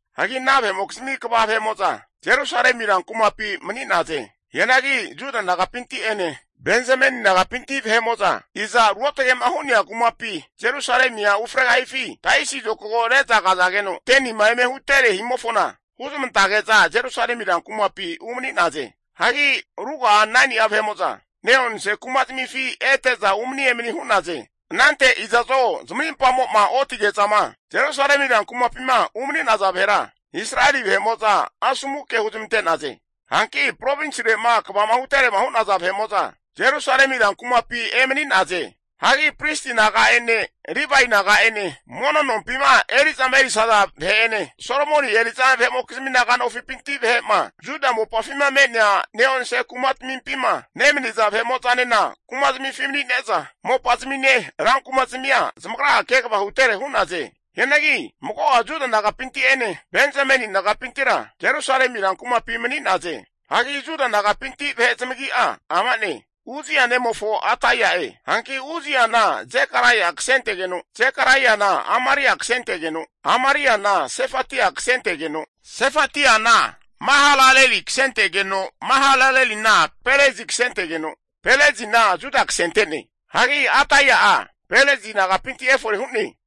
Hagi ana vahe'mokizmi kva vahe'mo'za Jerusalemi rankumapi mani'naze. Hianagi Juda nagapinti'ene Benzameni nagapinti vahe'mo'za, iza ruotge'ma hu'nea kumapi Jerusalemia ufregahifi taisi zokago re'za kazageno 10nima eme hutere himofona huzmantage'za Jerusalemi ran kumapi umani'naze. Hagi ruga'a 9ni'a vahe'mo'za ne'onse kumazamifi ete'za umani emani hu'naze. Anante iza'zo zamarimpamo'ma otige'zama Jerusalemi rankumapima umaniza vahera, Israeli vahe'mo'za asomu ke huzmante'naze. Hanki provinsirema kvama huterema hu'naza Jerusalemi rankumapi emani'naze. Hagi Pristi naga'ene Livae naga'ene, mono nompima eri'zama erisaza vahe'ene Solomoni eri'za vahe'mokizmi naga nofipinti vahe'ma Juda mopafima me'nea ne'onse kumatamimpima nemaniza vahe'mo'zanena kumazamifi mani'ne'za mopazamine rankumazmia zamagra'a kegava hutere hu'naze. Hianagi mago'a Juda nagapinti'ene Benzameni nagapintira Jerusalemi ran kumapi mani'naze. Hagi Juda nagapinti vahe zamagi'a ama'ne, Uzzia nemofo Ataia'e. Hanki Uzziana Zekaraia kasentegeno, Zekaraiana Amaria kasentegeno, Amariana Sefatia kasentegeno, Sefatiana Mahalaleli kasentegeno, Mahalalelina Perezi kasentegeno, Perezina Juda kasente'ne. Hagi Ataia'a Perezi nagapinti efore hu'ne.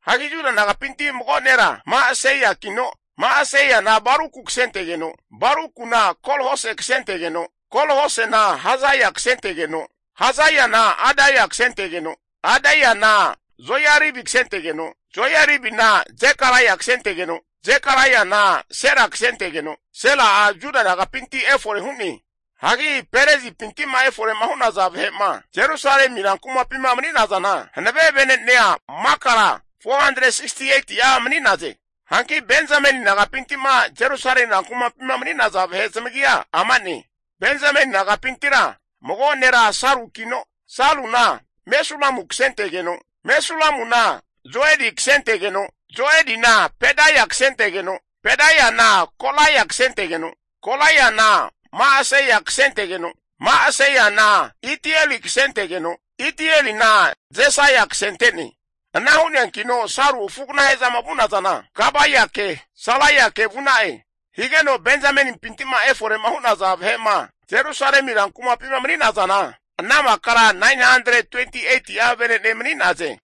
Hagi Juda nagapinti mago nera Ma'aseiakino, Ma'aseiana Baruku kasentegeno, Barukuna Kol-Hose kasentegeno, Kol-Hosena Hazaia kasentegeno, Hazaiana Adaia kasentegeno, Adaiana Joiaribi kasentegeno Joiaribina Zekaraia kasentegeno, Zekaraiana Sela kasentegeno, Sela'a Juda nagapinti efore hu'ne. Hagi Perezipinti'ma efore'ma hu'naza vahe'ma Jerusalemi rankumapima mani'nazana hanave vene'nea makara 468'a mani'naze. Hanki Benzameni nagapinti'ma Jerusalemi rankumapima mani'naza vahe zamagia ama'ne, Benzameni nagapintira mago nera Salukino, Saluna Mesulamu kasentegeno, Mesulamuna Joedi kasentegeno, Joedina Pedaia kasentegeno, Pedaiana Kolaia kasentegeno, Kolaiana Ma'aseia kasentegeno, Ma'aseiana Itieli kasentegeno, Itielina Jesaia kasente'ne. Ana hu'neankino Salu afu'aganahe'zama vu'nazana, Gabaike Salaike vu'na'e. Higeno Benzamenimpinti'ma efore'ma hu'naza vahe'ma Jerusalemi rankumapima mani'nazana, ana makara 928'a venene mani'naze.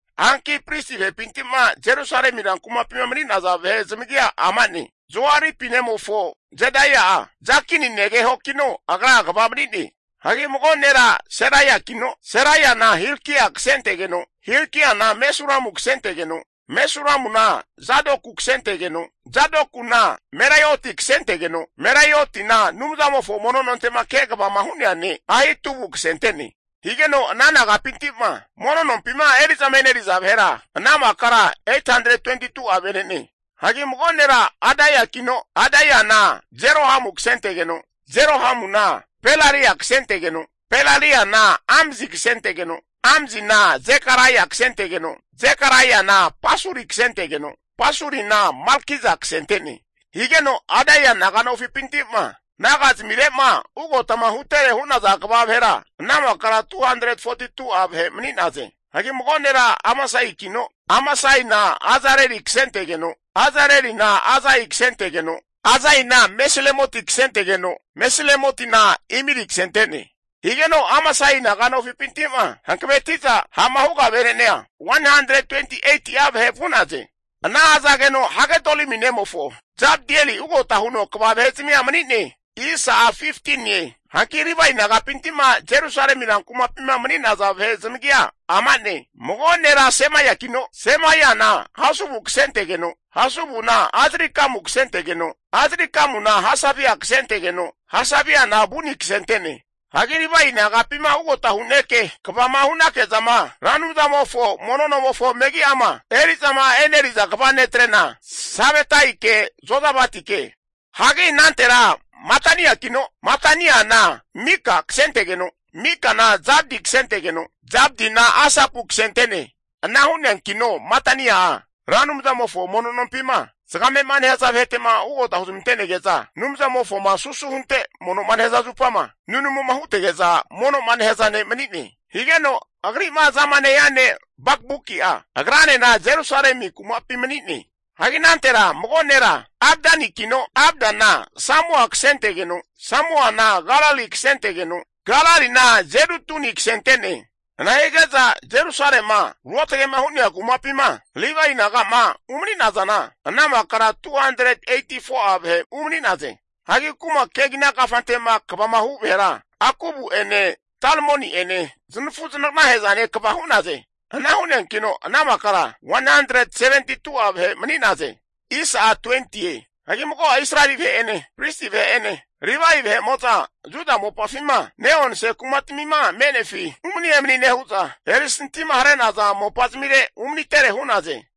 Hanki pristi vahepinti'ma Jerusalemi rankumapima mani'naza vahe zamagia ama'ne, Joaripi nemofo Jedaia'a Jakini negehokino agra kva mani'ne. Hagi mago nera Seraiakino Seraiana Hilkia kasentegeno, Hilkiana Mesulamu kasentegeno, Mesulamuna Zadoku kasentegeno, Zadokuna Meraioti kasentegeno, Meraiotina Anumzamofo mono nonte'ma kegavama hu'nea ne' Ahitubu kasente'ne. Higeno ana nagapinti'ma mono nompima eri'zama eri'naza vahera ana makara 822'a venene. Hagi mago nera Adaiakino, Adaiana Jerohamu kasentegeno, Jerohamuna Pelalia kasentegeno, Pelaliana Amzi kasentegeno, Amzina Zekaraia kasentegeno, Zekaraiana Pasuri kasentegeno, Pasurina Malkija kasente'ne. Higeno Adaia naga nofipinti'ma naga zamire'ma ugotama hutere hu'naza kva vahera, ana makara 242'a vahe mani'naze. Hagi mago nera Amasaikino, Amasaina Azareli kasentegeno, Azarelina Azai kasentegeno, Azaina Mesilemoti kasentegeno, Mesilemotina Imeri kasente'ne. Higeno Amasai naga nofipinti'ma hankaveti'za ha'ma huga vene'nea 128'a vahe vu'naze. Ana hazageno Hagedolimi nemofo Zabdieli ugota huno kva vahezamia mani'ne. Hanki Livae nagapinti'ma Jerusalemi rankumapima mani'naza vahe zamagia ama'ne, mago nera Semaiakino, Semaiana Hasubu kasentegeno, Hasubuna Azrikamu kasentegeno, Azrikamuna Hasabia kasentegeno, Hasabiana Buni kasente'ne. Hagi Livae nagapima ugota hu'neke kvama hu'nakezama Ra Anumzamofo mono nomofo megi'ama eri'zama eneriza kva netrena, Sabetaike Jozabatike. Hagi anantera Mataniakino Mataniana Mika kasentegeno, Mikana Zabdi kasentegeno, Zabdina Asapu kasente'ne. Ana hu'neankino Matania'a, Ra Anumzamofo mono nompima zagame'ma nehaza vahetema ugota huzmante'nege'za Anumzamofoma susu hunte mono'ma nehaza zupama nunamuma hutege'za mono'ma nehaza ne' manine. Higeno agri'ma azama nehia ne' Bakbuki'a agranena Jerusalemi kumapi mani'ne. Hagi anantera mago nera Abdakino Abdana Samua kasentegeno, Samuana Galali kasentegeno, Galalina Jedutuni kasente'ne. Ana hige'za Jerusalema ruotage'ma hu'nea kumapima Livae naga'ma umani'nazana ana makara 284'a vahe umani'naze. Hagi kuma kegina kafante'ma kvama hu vahera Akubu'ene Talmoni'ene zanafu zanagnahe'zane kva hu'naze. Ana hu'neankino ana makara 172'a vahe mani'naze. Hagi mago'a Israeli vahe'ene, pristi vahe'ene, Livae vahe'mo'za Juda mopafima ne'onse kumatamima me'nefi umani emani nehu'za, erisantima hare'naza mopa zamire umanitere hu'naze.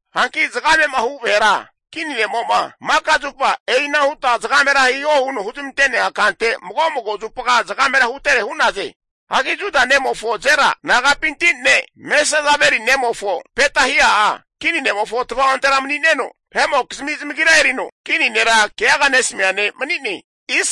Hanki zagame'ma hu vahera kini ne'mo'ma maka zupa e'ina huta zagamera hiho huno huzmante'nea kante mago mago zupa zagamera hutere hu'naze. Hagi Juda nemofo Zera nagapinti ne' Mesezabeli nemofo Petahia'a, kini ne'mofo tva'ontera mani'neno vahe'mokizmi zamagira erino kini nera keaga nesamia ne' mani'ne.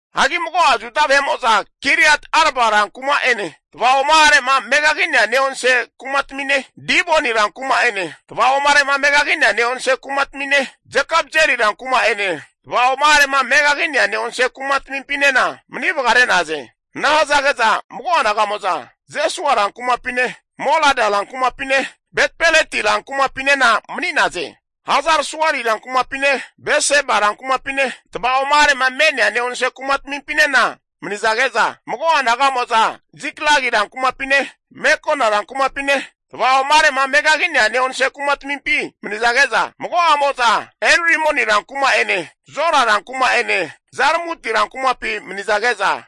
Hagi mago'a Juda vahe'ma Kiriat Arba rankuma'ene tva'oma'are'ma megagi'nea ne'onse kumatamine, Diboni rankuma'ene tva'oma'are'ma megagi'nea ne'onse kumatamine, Jekabzeli rankuma'ene, tva'oma'are'ma megagi'nea ne'onse kuma tamimpinena mani vagare'naze. Ana hazage'za mago'a naga'mo'za Jesua rankumapine, Molada rankumapine, Betpeleti rankumapinena mani'naze. Hazar-suali rankumapine, Beseba rankumapine tva'oma'arema me'nea ne'onse kumatamimpinena manizage'za, mago'a naga'mo'za Ziklagi rankumapine, Mekona rankumapine tva'oma'arema megagi'nea ne'onse kumatamimpi manizage'za, mago'amo'za Enrimoni rankuma'ene Zora rankuma'ene Jarmuti rankumapi manizage'za,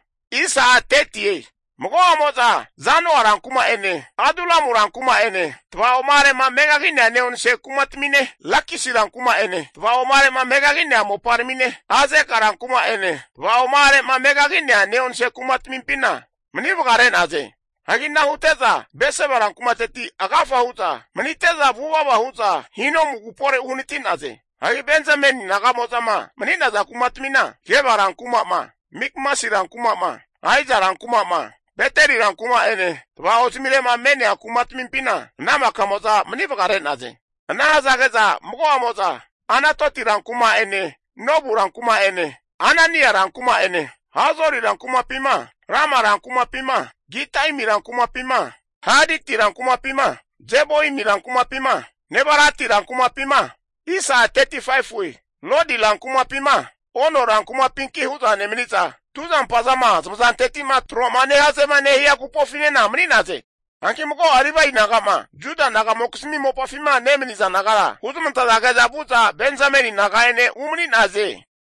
mago'amo'za Zanoa rankuma'ene Adulamu rankuma'ene tvaoma'arema megagi'nea ne'onse kumatamine, Lakisi rankuma'ene tva'oma'arema megagi'nea moparamine, Azeka rankuma'ene tva'oma'are'ma megagi'nea ne'onse kumatamimpina mani vagare'naze. Hagi ana hute'za Berseba rankumateti agafa hu'za manite'za vuvava hu'za Hinomu agupore uhanati'naze. Hagi Benzameni naga'mozama mani'naza kumatamina, Geba rankuma'ma, Mikmasi rankuma'ma, Aija rankuma'ma, Beteli rankuma'ene tva'ozamire'ma me'nea kumatamimpina ana makamo'za mani vagare'naze. Ana nehazage'za mago'amo'za, Anatoti rankuma'ene Nobu rankuma'ene, Anania rankuma'ene, Hazori rankumapima Rama rankumapima Gitaimi rankumapima, Haditi rankumapima, Zeboimi rankumapima, Nebalati rankumapima, Lodi rankumapima Ono rankumapinki hu'za nemani'za, tuzampazama zamazanteti'ma tro'ma nehazema nehaza agupofinena mani'naze. Hanki mago'a Livae naga'ma Juda naga'mokizmi mopafima nemaniza nagara huzamantazage'za vu'za Benzameni naga'ene umani'naze.